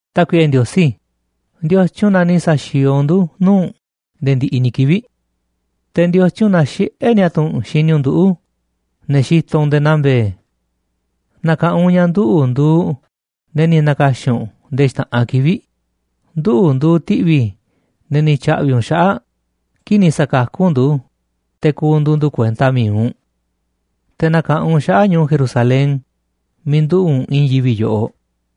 Tákuiꞌe Ndiosí, ¿ndiotyun na ni̱ sa̱xi̱o̱o̱ u̱nꞌ ndu̱ nuu̱ꞌ u̱nꞌ nde̱e̱ ndiꞌiꞌ ni̱ kivi̱ꞌ? Te̱, ¿ndiotyun na xiꞌé niatu̱ u̱nꞌ xini u̱nꞌ nduꞌu̱, ne̱ xitoꞌ u̱nꞌ nde̱e̱ naa mbe̱e̱? Na̱ka̱ꞌanꞌ u̱nꞌ ña̱ nduꞌu̱ꞌ nduuꞌ ne̱ ni̱ na̱ka̱xi̱n u̱nꞌ nde̱e̱ xta̱ꞌanꞌ kivi̱ꞌ, nduꞌu̱ nduuꞌ ti̱ꞌvi̱ ne̱ ni̱ tya̱ꞌvi̱ u̱nꞌ xaꞌa̱ꞌ kii̱ꞌ ni̱ sa̱kakú u̱nꞌ ndu̱, te̱ ku̱ndu̱u̱ ndu̱ kuenta mi̱iꞌ u̱nꞌ. Te̱ na̱ka̱ꞌanꞌ u̱nꞌ xaꞌa̱ꞌ ñu̱u̱ Jerusalén miiꞌ nduꞌu̱ꞌ u̱nꞌ i̱i̱n yivi̱ꞌ yoꞌoꞌ.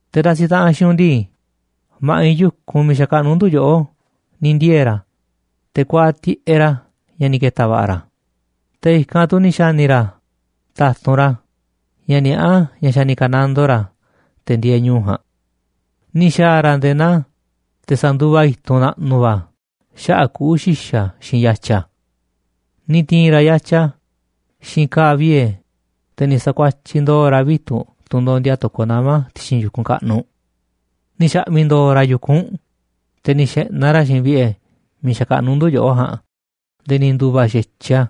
Te̱ ndasiꞌ taꞌanꞌ xiinꞌ u̱nꞌ ndii, ma̱ꞌiꞌ yu̱kunꞌ miiꞌ xakaꞌnuꞌ ndu̱ yoꞌó ni̱ ndiee̱ ra̱, te̱ kuaaꞌ tiꞌeꞌ ra̱ ña̱ ni̱ ke̱ta̱ va̱ꞌa̱ ra̱, te̱ i̱kanꞌ tu̱ ni̱ xa̱ni̱ ra̱ ta̱tunꞌ ra̱ ña̱ niaꞌá ña̱ xa̱ ni̱ ka̱nandoo ra̱ te̱ ndieeꞌ ñu̱u̱ ja̱a̱nꞌ. Ni̱ xa̱a̱ ra̱ nde̱e̱ naa te̱ sanduva i̱tunꞌ naꞌnuꞌ va̱ xaꞌa̱ꞌ kuꞌu̱ xi̱xa̱ xiinꞌ yatya. Ni̱ ti̱i̱n ra̱ yatya xiinꞌ ka̱a̱ vie̱, te̱ ni̱ sa̱kuatyiꞌ ndo̱o̱ ra̱ vitu̱ꞌ, tunꞌ ndondia to̱koꞌ nama̱ ti̱xi̱n yu̱kunꞌ kaꞌnuꞌ. Ni̱ xa̱ꞌmi̱ ndo̱o̱ ra̱ yu̱kunꞌ u̱nꞌ, te̱ ni̱ xe̱ꞌnaꞌ ra̱ xiinꞌ vi̱ꞌe̱ miiꞌ xakaꞌnuꞌ ndu̱ yoꞌó ja̱a̱nꞌ nde̱e̱ ni̱ ndu̱va̱ xa̱tyiꞌ a̱.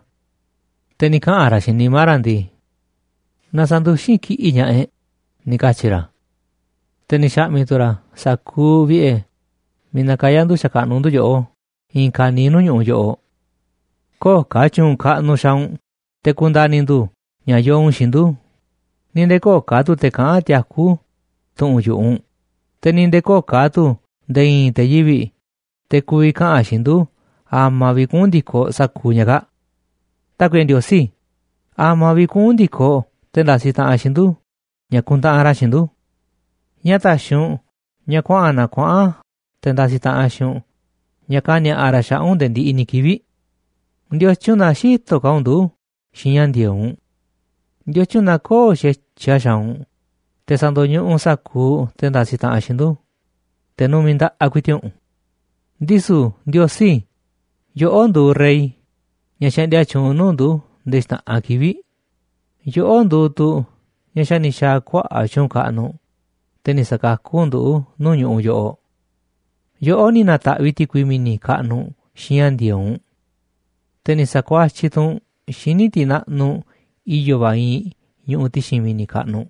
Te̱ ni̱ kaꞌa̱n ra̱ xiinꞌ nimá ra̱ ndii: “Na sa̱nduxín kiꞌi̱ꞌ ña̱ꞌaꞌ e̱ꞌ”, ni̱ katyi̱ ra̱. Te̱ ni̱ xa̱ꞌmi̱ tu̱ ra̱ sa̱kuuꞌ vi̱ꞌe̱ miiꞌ nakayá ndu̱ xakaꞌnuꞌ ndu̱ yoꞌó i̱i̱n ka̱niiꞌ nuu̱ꞌ ñu̱ꞌuꞌ yoꞌoꞌ. Köo̱ꞌ ka̱ tyu̱u̱n kaꞌnuꞌ xaaꞌ u̱nꞌ te̱ ku̱nda̱ni̱ ndu̱ ña̱ yoo u̱nꞌ xiinꞌ ndu̱, ni̱ nde̱e̱ köo̱ꞌ ka̱ tu̱ te̱ kaꞌán tiakú tu̱ꞌu̱n yu̱ꞌuꞌ u̱nꞌ, te̱ ni̱ nde̱e̱ köo̱ꞌ tu̱ nde̱e̱ i̱i̱n te̱ yivi̱ꞌ, te̱ ku̱vi̱ kaꞌa̱n xiinꞌ ndu̱ a̱ma̱ vi̱ꞌ kuꞌu̱n ndi̱koꞌ sa̱kuuꞌ ña̱ kaa̱ꞌ. Tákuiꞌe Ndiosí, ¿a̱ma̱ vi̱ꞌ kuꞌu̱n ndi̱koꞌ te̱ ndasiꞌ taꞌanꞌ xiinꞌ ndu̱ ña̱ kuntaꞌanꞌ ra̱ xiinꞌ ndu̱? ¿Ñáá ta̱xi̱ u̱nꞌ ña̱ kuaꞌa̱n na kuaꞌa̱n te̱ ndasiꞌ taꞌanꞌ xiinꞌ u̱nꞌ ña̱ kani̱a̱ꞌa ra̱ xaꞌa̱ꞌ u̱nꞌ nde̱e̱ ndiꞌiꞌ ni̱ kivi̱ꞌ? ¿Ndiotyun na xïtoꞌ ka̱ u̱nꞌ ndu̱ xiinꞌ ña̱ ndi̱e̱eꞌ u̱nꞌ? ¿Ndiotyun na köo̱ꞌ xa̱tyiꞌ a̱ xaaꞌ u̱nꞌ te̱ sa̱ndo̱ñuꞌuꞌ u̱nꞌ sa̱kuuꞌ te̱ ndasiꞌ taꞌanꞌ xiinꞌ ndu̱, te̱ numiꞌ nda̱ꞌaꞌ ku̱i̱ti̱ꞌ u̱nꞌ? Ndisu̱ Ndiosí, yoꞌó nduuꞌ rey ña̱ xaꞌndia tyuunꞌ nuu̱ꞌ ndu̱ nde̱e̱ xta̱ꞌanꞌ kivi̱ꞌ, yoꞌó nduuꞌ tu̱ ña̱ xa̱ ni̱ xa̱a̱ kuaꞌa̱ꞌ tyu̱u̱n kaꞌnuꞌ, te̱ ni̱ sa̱kakú u̱nꞌ ndu̱ nuu̱ꞌ ñu̱ꞌuꞌ yoꞌoꞌ. Yoꞌó ni̱ na̱ta̱ꞌviꞌ ti̱kui mi̱ni̱ kaꞌnuꞌ xiinꞌ ña̱ ndi̱e̱eꞌ u̱nꞌ, te̱ ni̱ sa̱kuatyiꞌ tu̱ u̱nꞌ xíniꞌ tiꞌ naꞌnuꞌ i̱yo̱ va̱ iinꞌ ñuꞌuꞌ ti̱xi̱n mi̱ni̱ kaꞌnuꞌ.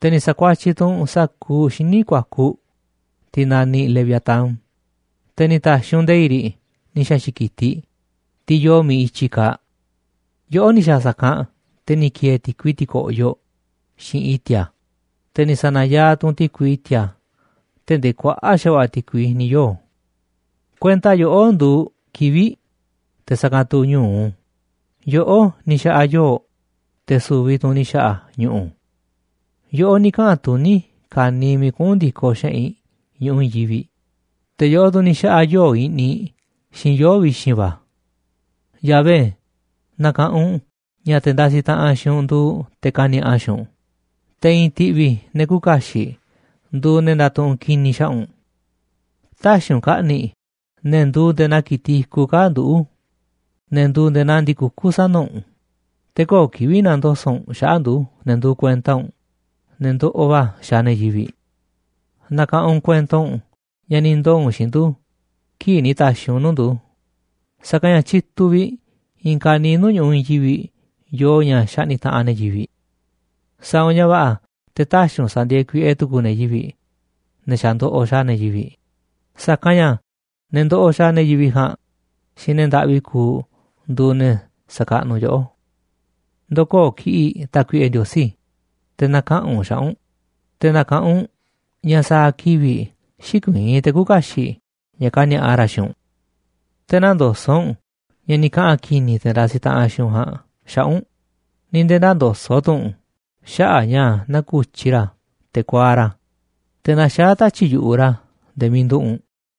Te̱ ni̱ sa̱kuatyiꞌ tu̱ u̱nꞌ sa̱kuuꞌ xíniꞌ ku̱a̱kuꞌ, tiꞌ naniꞌ leviatán, te̱ ni̱ ta̱xi̱ u̱nꞌ nde̱i̱ꞌ riꞌ ni̱ xa̱xi̱ꞌ ki̱tiꞌ, tiꞌ yoo miiꞌ i̱tyi kaaꞌ. Yoꞌó ni̱ xa̱a̱ sa̱kanꞌ te̱ ni̱ ki̱e̱e̱ ti̱kui ti̱ko̱ꞌyoꞌ xiinꞌ i̱ti̱a̱, te̱ ni̱ sa̱na̱yaaꞌ tu̱ u̱nꞌ ti̱kui i̱ti̱a̱ tee̱ꞌ ndee kuaꞌa̱ꞌ xa̱va̱ꞌa̱ ti̱kui ni̱ yoo̱. Kuenta yoꞌó nduuꞌ kivi̱ꞌ, te̱ sa̱kanꞌ tu̱ ñu̱u, yoꞌó ni̱ xa̱ꞌa̱ yoo̱, te̱ su̱vi̱ tu̱ u̱nꞌ ni̱ xa̱ꞌa̱ ñu̱ꞌu̱. Yoꞌó ni̱ kaꞌa̱n tuní ka̱niiꞌ miiꞌ kuꞌu̱n ndi̱koꞌ xeꞌinꞌ ñu̱ꞌuꞌ i̱i̱n yivi̱ꞌ, te̱ yoꞌó tu̱ ni̱ xa̱ꞌa̱ yoo̱ꞌ i̱ꞌniꞌ xiinꞌ yoo̱ꞌ vi̱xi̱n va̱. Yahvé, na̱ka̱ꞌanꞌ u̱nꞌ ña̱ te̱ ndasiꞌ taꞌanꞌ xiinꞌ u̱nꞌ nduuꞌ te̱ kani̱a̱ꞌa xiinꞌ u̱nꞌ, te̱ i̱i̱n ti̱ꞌvi̱ ne̱ küuꞌ kaxiꞌ nduuꞌ ne̱ ndatuꞌunꞌ ki̱ni̱ xaꞌa̱ꞌ u̱nꞌ. Tä̱xi̱ u̱nꞌ ka̱ꞌni̱ꞌ ne̱ nduuꞌ nde̱e̱ naa ki̱tiꞌ i̱kuꞌ kaa̱ꞌ nduꞌu̱ꞌ, ne̱ nduuꞌ nde̱e̱ naa ndi̱ku̱kú sana̱ u̱nꞌ, te̱ köo̱ꞌ kivi̱ꞌ na̱ndoso̱ꞌ u̱nꞌ xaꞌa̱ꞌ ndu̱, ne̱ nduuꞌ kuenta u̱nꞌ, ne̱ ndoꞌoꞌ va̱ xaaꞌ ne̱ yivi̱ꞌ. Na̱ka̱ꞌanꞌ u̱nꞌ kuento ña̱ ni̱ ndoo̱ u̱nꞌ xiinꞌ ndu̱ kii̱ꞌ ni̱ ta̱xi̱ u̱nꞌ u̱n nuu̱ꞌ ndu̱, sa̱kanꞌ ña̱ tyituꞌ vi̱ꞌ i̱i̱n ka̱niiꞌ nuu̱ꞌ ñu̱ꞌuꞌ i̱i̱n yivi̱ꞌ yoo ña̱ xaꞌni̱ꞌ taꞌanꞌ ne̱ yivi̱ꞌ. Sa̱a̱ u̱nꞌ ña̱ va̱ꞌa̱ te̱ tä̱xi̱ u̱nꞌ sa̱ndi̱e̱e̱ kuiꞌe tu̱ku̱u̱ ne̱ yivi̱ꞌ, ne̱ xa̱ ndoꞌoꞌ xaaꞌ ne̱ yivi̱ꞌ, sa̱kanꞌ ña̱ ne̱ ndoꞌoꞌ xaaꞌ ne̱ yivi̱ꞌ ja̱a̱nꞌ xiinꞌ ne̱ ndaꞌvi kuuꞌ nduuꞌ ne̱ sa̱kaꞌnuꞌ yoꞌó. Ndo̱koo̱ kiꞌi̱ꞌ, Tákuiꞌe Ndiosí, te̱ na̱kaꞌa̱n u̱nꞌ xaꞌa̱ꞌ u̱nꞌ, te̱ na̱ka̱ꞌanꞌ u̱nꞌ ña̱ sa̱a̱ kivi̱ꞌ xïkuiín te̱ küuꞌ kaxiꞌ ña̱ kani̱a̱ꞌa ra̱ xiinꞌ u̱nꞌ. Te̱ nä̱ndoso̱ꞌ u̱nꞌ ña̱ ni̱ kaꞌa̱n ki̱ni̱ te̱ ndasiꞌ taꞌanꞌ xiinꞌ u̱nꞌ ja̱a̱nꞌ xaꞌa̱ꞌ u̱nꞌ, ni̱ nde̱e̱ nä̱ndoso̱ꞌ tu̱ u̱nꞌ xaꞌa̱ꞌ ña̱ naku̱tyi ra̱ te̱ kuaaꞌ ra̱, te̱ naxaá tatyi̱ꞌ yu̱ꞌuꞌ ra̱ nde̱e̱ miiꞌ nduꞌu̱ꞌ u̱nꞌ.